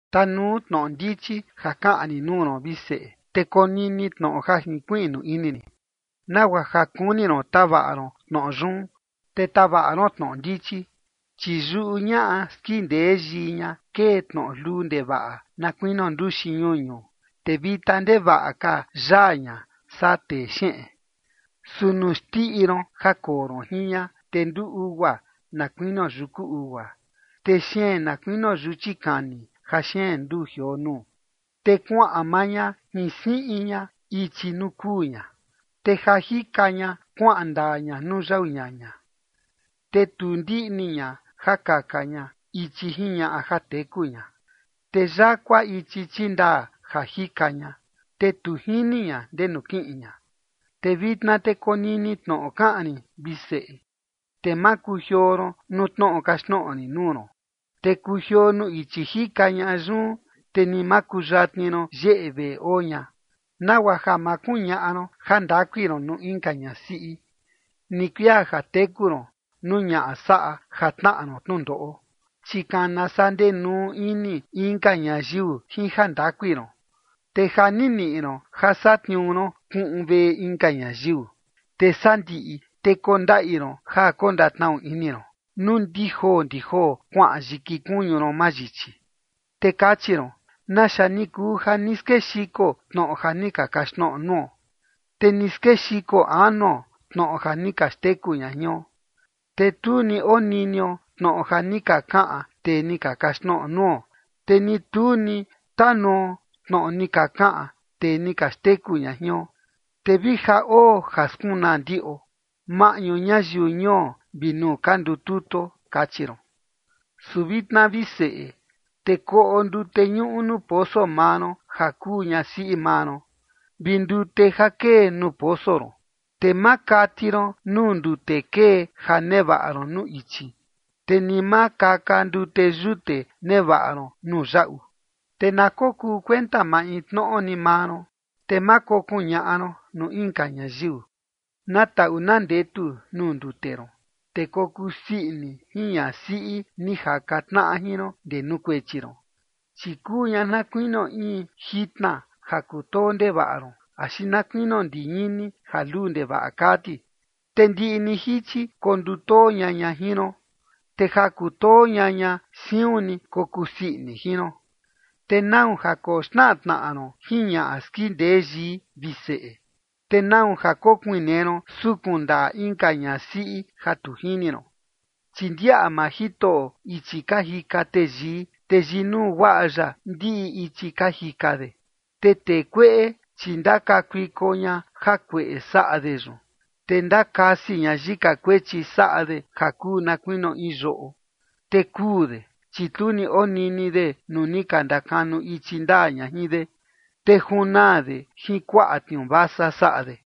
Tanuu tnoꞌo ndichi ja kaꞌan rin nuu ron, vi seꞌe, te konini tnoꞌo ja jinkuiꞌnu ini rin, nagua ja kuni ron tavaꞌa ron tnoꞌo yun, te tavaꞌa ron tnoꞌo ndichi. Chi yuꞌu ñaꞌa skindee yii ña kee tnoꞌo luu ndevaꞌa na kuinio nduxi ñuñu, te vita ndevaꞌa ka yaa ña saa texeꞌen. Su nuu xndiꞌi ron ja koo ron jin ña, te nduu ugua, na kuinio yuku ugua, te xeen na kuinio yuchi kani ja xeen nduu jioo nuu. Te kuaꞌan maa ña jin siꞌin ña ichi nuu kuu ña, te ja jika ña kuaꞌan ndaa ña nuu yau ñaña. Te tu ndiꞌni ña ja kaka ña ichi jiñaꞌa ja teku ña, te yakua ichi chindaa ja jika ña, te tu jini ña ndenu kiꞌin ña. Te vitna te konini tnoꞌo kaꞌan rin, vi seꞌe, te ma kujioo ron nuu tnoꞌo kaxtnoꞌo rin nuu ron. Te kujioo nuu ichi jika ñaꞌa yun, te ni ma kuyatni ron yeꞌe veꞌe oo ña, nagua ja ma kuñaꞌa ron jandakui ron nuu inka ñasiꞌi, ni kuia ja teku ron nuu ñaꞌa saꞌa ja tnaꞌa ron tnundoꞌo. Chi kana saa ndenuu ini inka ñayiu jin jandakui ron, te ja ni niꞌi ron ja satniuu ron kuꞌun veꞌe inka ñayiu. Te sandiꞌi te kondaꞌi ron ja kondatnaꞌu ini ron nuu ndi joo ndi joo kuaꞌan yiki kuñu ron mayichi. Te kachi ron: “¿Naxa ni kuu ja ni skexiko tnoꞌo ja ni ka kaxtnoꞌo nuo? Te ni skexiko anuo tnoꞌo ja ni ka xteku ña jion. Te tu ni oninio tnoꞌo ni ka kaꞌan tee ni ka kaxtnoꞌo nuo, te ni tu ni tanuo tnoꞌo ni ka kaꞌan tee ni ka xteku ña jion. Te vi ja oo ja skunaa ndiꞌo maꞌñu ñayiu ñuo vi nuu ka ndututuo”, kachi ron. Su vitna, vi seꞌe, te koꞌo ndute ñuꞌu nuu poso maa ron ja kuu ñasiꞌi maa ron, vi ndute ja kee nuu poso ron. Te ma kati ron nuu ndute kee ja nevaꞌa ron nuu ichi, te ni ma kaka ndute yute nevaꞌa ron nuu yaꞌu. Te na kokuu kuenta maintnoꞌo ni maa ron, te ma kokuñaꞌa ron nuu inka ñayiu. Na taꞌu na ndetu nuu ndute ron, te kokuu sii ini jin ñasiꞌi ni jaka tnaꞌa jin ron ndee nuu kuechi ron. Chi kuu ña na kuinio in jitna ja kutoo ndevaꞌa ron, axi na kuinio ndiñini ja luu ndevaꞌa kaa ti. Te ndiꞌi ni jichi kondutoo ña ña jin ron, te ja kutoo ña ña siun ni kokuu sii ini jin ron. ¿Te nau ja koxnaꞌa tnaꞌa ron jin ñaꞌa skindee yii, vi seꞌe? ¿Te nau ja kokuinee ron sukun ndaꞌa inka ñasiꞌi ja tu jini ron? Chi ndiaꞌa maa Jitoꞌo ichi ka jika teyii, te yinuu guaꞌa ya ndiꞌi ichi ka jika de. Te tee kueꞌe, chi ndakakuiko ña jakueꞌe saꞌa de yun, te ndakasi ña yika kuechi saꞌa de ja kuu na kuinio in yoꞌo. Te kuu de, chi tu ni onini de nuu ni ka ndakanu ichi ndaa ña jin de, te junaa de jin kuaꞌa tniuu vasa saꞌa de.